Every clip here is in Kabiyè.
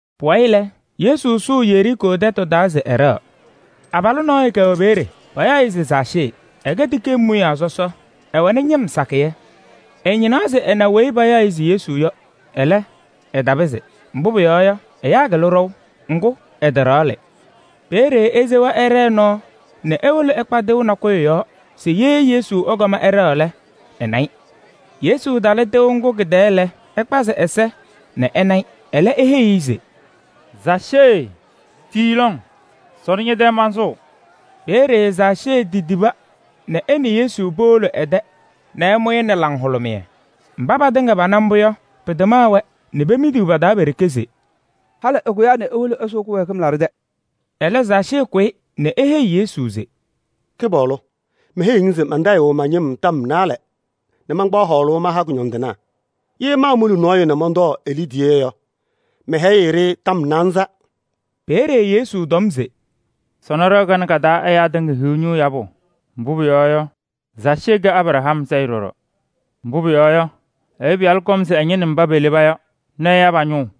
Pʋwayɩ lɛ, Yesu sʋʋ Yeriikoo tɛtʋ taa se ɛɖɛɣ. Abalʋ nɔɔyʋ kɛwɛ peeye, payaɣ-ɩ se Zaacee. Ɛkɛ tikee mʋyaa sɔsɔ, ɛwɛnɩ ñɩm sakɩyɛ. Ɛñɩnaɣ se ɛna weyi payaɣ se Yesu yɔ, ɛlɛ, ɛtapɩzɩ. Mbʋ pʋyɔɔ yɔ, ɛyaa kɩlɩ ɖɔʋ. Ŋgʋ, ɛtaɖaɣlɩ. Peeye esewa ɛɖɛɛ nɔɔ nɛ ewolo ɛkpa tɩʋ nakʋyʋ yɔɔ se Yesu ɛkɔm ɛɖɛɣ lɛ, ɛna-ɩ. Yesu talɩ tɩʋ ŋgʋ kɩ-tɛɛ lɛ, ɛkpazɩ ɛ-ɛza nɛ ɛna-ɩ. Ɛlɛ eheyi-i se: “Zaacee tii lɔŋ! Sɔnɔ ñɛ-tɛ mansʋʋ.” Peeye Zaacee titiba nɛ ɛ nɛ Yesu powolo ɛ-tɛ nɛ ɛmʋ-ɩ nɛ laŋhʋlʋmɩyɛ. Mba patɩŋa pana mbʋ yɔ, pɩtamaɣ-wɛ nɛ pemidiɣ pa-taa pe-ɖeke se: “Halɩ ɛkʋyaa nɛ ewolo ɛsʋʋ kɩwɛɛkɩm laɖʋ tɛ!” Ɛlɛ Zaacee kʋyɩ nɛ eheyi Yesu se: “Kɩpaɣlʋ! Meheyiɣ-ŋ se mantayɩɣ ma-ñɩm tɔm naalɛ nɛ mankpaɣ hɔɔlʋʋ maha kʋñɔndɩnaa. Ye maamuli nɔɔyʋ nɛ mɔntɔɔ e-liidiye yɔ, mɛhɛyɩ-ɩ ɖɩ-tɔm naanza.” Peeye Yesu tɔm se: “Sɔnɔ ɖɩɣa kanɛ ka-taa ɛyaa tɩŋa hiɣ ñʋʋ yabʋ. Mbʋ pʋyɔɔ yɔ, Zaacee kɛ Abraham sayɩ ɖɔɖɔ. Mbʋ pʋyɔɔ yɔ, Ɛyʋ Pɩyalʋ kɔm se ɛñɩnɩ mba peleba yɔ nɛ ɛya pa-ñʋʋ.”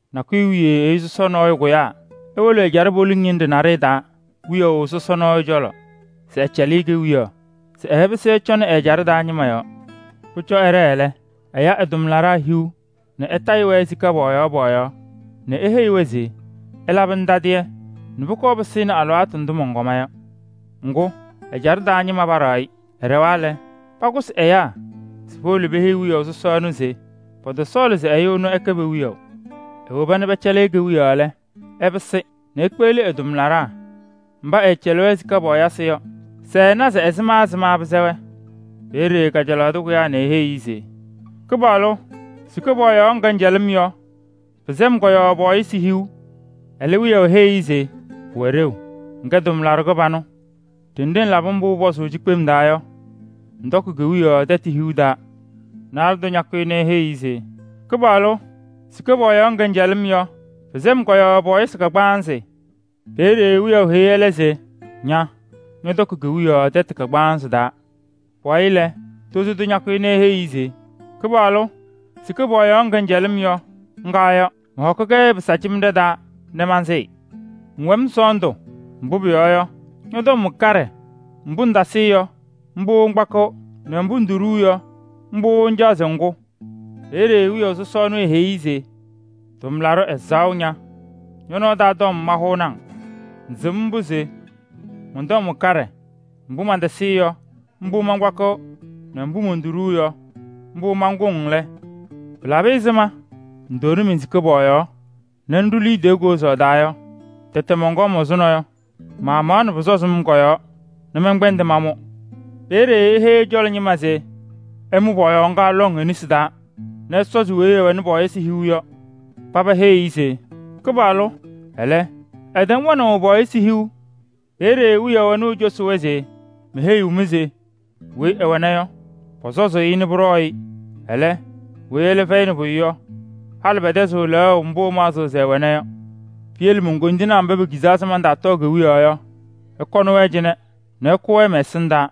“Nakʋyʋ wiye ɛyʋ sɔsɔ nɔɔyʋ kʋyaa ewolo ɛjaɖɛ poliŋ ñɩnɖɛ naɖɩyɛ taa wiyaʋ sɔsɔ cɔlɔ se ɛcɛlɩ-ɩ kewiyaɣ nɛ ɛɛpɩsɩ ɛcɔnɩ ɛ-ɛjaɖɛ taa ñɩma yɔɔ. Pʋcɔ ɛɖɛɛ lɛ, ɛya ɛ-tʋmlaɖaa hiu nɛ ɛtayɩ-wɛ sika pɔɔyaɣ pɔɔyaɣ nɛ eheyi-wɛ se: ‘Ɩlabɩnɩ tadɩyɛ nɛ pʋkɔɔ pɩsɩnɩ alɩwaatʋ ndʋ mɔnkɔma yɔ.’ Ŋgʋ, ɛ-ɛjaɖɛ taa ñɩma paɖaɣ-ɩ. Ɛɖɛwa lɛ, pakʋsɩ ɛyaa se powolo peheyi wiyaʋ sɔsɔ ɛnʋ se pɔtɔsɔɔlɩ se ɛyʋ ɛnʋ ɛkɛ pe-wiyaʋ. Ewoba nɛ pɛcɛlɩ-ɩ kewiyaɣ lɛ, ɛpɩsɩ nɛ ekpeɣli ɛ-tʋmlaɖaa mba ɛɛcɛlɩ-wɛ sika pɔɔyɩsɩ yɔ se ɛna se ɛzɩma ɛzɩma pɩsɛ-wɛ. Peeye kajalaɣ tʋ kʋyaa nɛ eheyi-i se: ‘Kɩpaɣlʋ! Sika pɔɔyaɣ ŋga ŋcɛlɩ-m yɔ, pɩsɛ-m kɔ-yɔɔ pɔɔyɩsɩ hiu.’ Ɛlɛ wiyaʋ heyi-i se: ‘Pʋwɛ ɖeu, ŋkɛ tʋmlaɖʋ kɩbanʋ. Ɖenɖe ŋlabɩ mbʋ pʋpɔzʋʋ yɔ cikpem taa yɔ, ŋtɔkɩ kewiyaɣ tɛtʋ hiu yɔɔ.’ Naalɛ tʋ ñakʋyɩ nɛ eheyi-i se: ‘Kɩpaɣlʋ! Sika pɔɔyaɣ ŋga ŋcɛlɩ-m yɔ, pɩsɛ-m kɔ-yɔɔ pɔɔyɩsɩ kagbaanzɩ.’ Peeye wiyaʋ heyi ɛlɛ se: ‘Ña ñɔtɔkɩ kewiyaɣ tɛtʋ kagbaanzɩ yɔɔ.’ Pʋwayɩ lɛ, tozo tʋ ñakʋyɩ nɛ eheyi-i se: ‘Kɩpaɣlʋ! Sika pɔɔyaɣ ŋga ŋcɛlɩ-m yɔ, ŋga yɔ. Mɔhɔkɩ-kɛ pɩsaacemɖe taa nɛ mansɩɩ. Ŋwɛ-m sɔɔndʋ, mbʋ pʋyɔɔ yɔ, ñɔ-tɔm wɛ kaɖɛ. Mbʋ ŋtasɩɩ yɔ, mbʋ ŋkpakɩɣ, nɛ mbʋ ŋtoɖuu yɔ, mbʋ ŋcaɣ se ŋkʋ.’ Peeye wiyaʋ sɔsɔ ɛnʋ eheyi-i se: ‘Tʋmlaɖʋ ɛzaɣʋ ña! Ñɔ-nɔɔ taa tɔm mahʋʋnɩ-ŋ. Ŋsɩm mbʋ se mɔn-tɔm wɛ kaɖɛ nɛ mbʋ mantasɩɩ yɔ, mbʋ mankpakɩɣ nɛ mbʋ montoɖuu yɔ, mbʋ mankʋŋ lɛ, pɩla ɛzɩma ŋtaawoni men-sika pɔɔyaɣ nɛ ŋɖʋ liidiye kozaɣ taa yɔ? Tɛtɛɣ mɔnkɔm ɛzʋnɔ yɔ, maamaɣnɩ pʋsɔzɩ-m kɔ-yɔɔ nɛ mɛnkpɛndɩ mamʋ.’ Peeye eheyi ɛ-cɔlɔ ñɩma se: ‘Ɩmʋ pɔɔyaɣ ŋga lɔŋ e-nesi taa nɛ ɩsɔzɩ weyi ɛwɛnɩ pɔɔyɩsɩ hiu yɔ.’ Paba heyi-i se: ‘Kɩpaɣlʋ! Ɛlɛ tɛm wɛnaʋ pɔɔyɩsɩ hiu!’ Peeye wiyaʋ ɛnʋ ecosi-wɛ se: ‘Meheyiɣ-mɩ se weyi ɛwɛna yɔ, pɔsɔzʋʋ-ɩ nɛ pʋɖɔɔ-ɩ. Ɛlɛ, weyi ɛlɛ fɛyɩnɩ pʋyʋ yɔ, halɩ pɛtɛzɩɣ lɛɣʋ mbʋ ɛmaɣzɩɣ se ɛwɛna yɔ. Piyele mon-koyindinaa mba pekizaa se mantaatɔɔ kewiyaɣ yɔ, ɩkɔnɩ-wɛ cɩnɛ nɛ ɩkʋ-wɛ mɛ-ɛsɩndaa.’”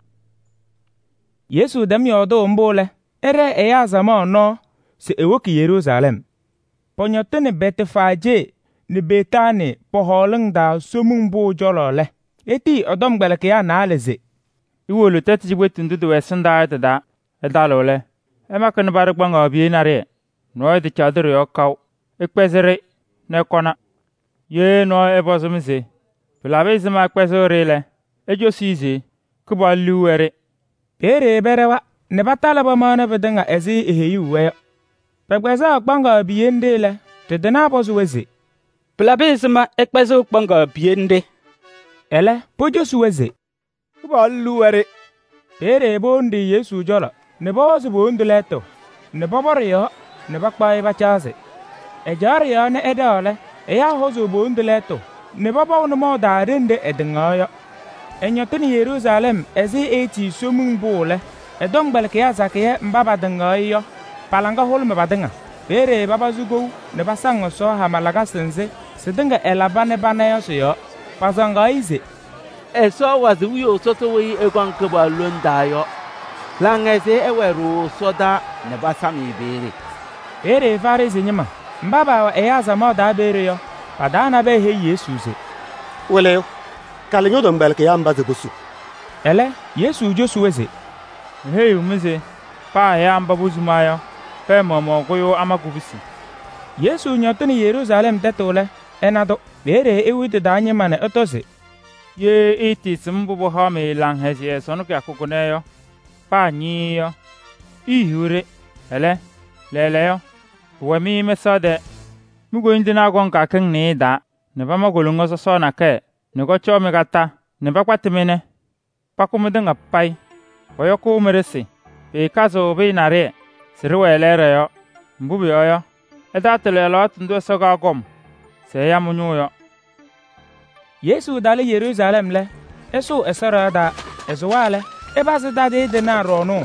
Yesu tɛm yɔɔdʋʋ mbʋ lɛ, ɛɖɛɛ ɛyaa samaɣ nɔɔ se ewoki Yeruusalɛm. Pɔñɔtɩnɩ Bɛtfaajee nɛ Betaanii pɔ-hɔɔlʋʋ taa Somiŋ Pʋʋ cɔlɔ lɛ, etiyi ɛ-tɔmkpɛlɩkɩyaa naalɛ se: “Iwolo tɛtʋ cikpetu nɖʋ tɩwɛ ɛsɩndaa yɔ tɩ-taa. Ɩtalɩɣ lɛ, ɩmakɩnɩ paɖɩ kpaŋaɣ piye naɖɩyɛ. Nɔɔyʋ tacaɣdɩ ɖɩ-yɔɔ kaʋ. Ɩkpɛzɩ-ɖɩ nɛ ɩkɔna. Ye nɔɔyʋ ɛpɔzɩ-mɩ se: ‘Pɩlabɩ ɛzɩma ɩkpɛzɩɣ-ɖɩ’ lɛ, icosi-i se: ‘Kɩpaɣlʋ liu wɛ-ɖɩ.’” Peeye pɛɖɛwa nɛ patalɩ pamaɣnɩ pɩtɩŋa ɛzɩ eeheyuu-wɛ yɔ. Pɛkpɛzaɣ kpaŋaɣ piye nɖɩ lɛ, ɖɩ-tɩnaa pɔzɩ-wɛ se: “Pɩlabɩ ɛzɩma ɩkpɛzɩɣ kpaŋaɣ piye nɖɩ?” Ɛlɛ pocosi-wɛ se: “Kɩpaɣlʋ liu wɛ-ɖɩ.” Peeye powoni-ɖɩ Yesu cɔlɔ nɛ pɔhɔzɩ po-wondu lɛɛtʋ nɛ pɔpɔ ɖɩ-yɔɔ nɛ pakpaɣ-ɩ pacaɣzɩ. Ɛcaɣ ɖɩ-yɔɔ nɛ ɛɖɛɣ lɛ, ɛyaa hɔzʋʋ po-wondu lɛɛtʋ nɛ pɔpɔʋ nʋmɔʋ taa ɖenɖe ɛtɩŋaɣna yɔ. Ɛñɔtɩnɩ Yeruusalɛm ɛzɩ eetii Somiŋ Pʋʋ lɛ, ɛ-tɔmkpɛlɩkɩyaa sakɩyɛ mba patɩŋaɣ-ɩ yɔ, pa-laŋa hʋlʋmɩ patɩŋa. Peeye papazɩ kou nɛ pasaŋ Ɛsɔ, hama lakasɩ nzɩ sɩtɩŋa ɛlaba nɛ pana yɔ sɩ-yɔɔ. Pasaŋaɣ-ɩ se: “Ɛsɔ ɛwazɩ wiyaʋ sɔsɔ weyi ɛkɔŋ Kɩpaɣlʋ lone taa yɔ ɛ-yɔɔ! Laŋhɛzɩyɛ ɛwɛɛ ɖooo ɛsɔdaa nɛ pasam-ɩ peeye!” Peeye Farɩsɩ ñɩma mba paawɛ ɛyaa samaɣ taa peeye yɔ, pa-taa nabɛyɛ heyi Yesu se: “Wɩlɩyʋ! Kalɩ ñɔ-tɔmkpɛlɩkɩyaa mba se posu.” Ɛlɛ Yesu cosi-wɛ se: “Meheyiɣ-mɩ se paa ɛyaa mba posuma yɔ, pɛɛ maɣmaɣ kʋyʋʋ ama kubusi!” Yesu ñɔtɩnɩ Yeruusalɛm tɛtʋ lɛ, ɛna-tʋ. Peeye ewi tɩ-taa ñɩma nɛ ɛtɔ se: “Ye ɩɩtɩɩsɩm mbʋ pɩhaɣ-mɩ laŋhɛzɩyɛ sɔnɔ kɩyakʋ kʋnɛ yɔ paa ñɩɩɩ yɔ, iihiɣ-ɖɩ! Ɛlɛ, lɛɛlɛɛyɔ, pʋwɛ-mɩ mɛsaɣ tɛɛ. Mi-koyindinaa kɔŋ kɩyakɩŋ nɩɩyɩ taa nɛ pama koloŋa sɔsɔɔ nakɛyɛ nɛ kɔcɔɔ-mɩ kondiko nɛ pakpatasɩ-mɩ nɛ pakʋ mɩtɩŋa payɩ. Pɔyɔkʋʋ mɩ-ɖɩsɩ, pɩɩkazɩɣ pɩyɛ naɖɩyɛ se ɖɩwɛ lɛɛɖɛ yɔɔ. Mbʋ pʋyɔɔ yɔ, ɩtaatɩlɩ alɩwaatʋ ndʋ Ɛsɔ kaakɔm se ɛya mɩ-ñʋʋ yɔ.” Yesu talɩ Yeruusalɛm lɛ, ɛsʋʋ Ɛsɔ ɖɩɣa taa. Ɛsʋwa lɛ, ɛpazɩ tadɩyɛ tɩnaa ɖɔɔnʋʋ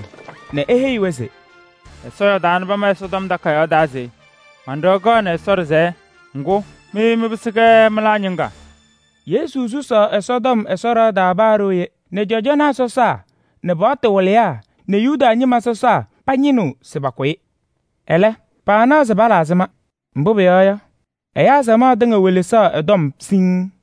nɛ eheyi-wɛ se: “Ɛsɔ yɔɔdaa nɛ pama Ɛsɔtɔm Takayaɣ taa se: ‘Man-ɖɩɣa kɛɣnɩ Ɛsɔ ɖɩsɛyɛ.’ Ŋgʋ, mɩ mɩpɩsɩ-kɛ mɩlaa ñɩŋga.” Yesu susaɣ Ɛsɔtɔm Ɛsɔ ɖɩɣa taa paa ɖooye nɛ cɔjɔnaa sɔsaa nɛ paɣtʋ wɩlɩyaa nɛ Yuda ñɩma sɔsaa pañɩnɩɣ se pakʋ-ɩ. Ɛlɛ, paanaɣ se pala ɛzɩma. Mbʋ pʋyɔɔ yɔ, ɛyaa samaɣ tɩŋa welesaɣ ɛ-tɔm siŋŋ.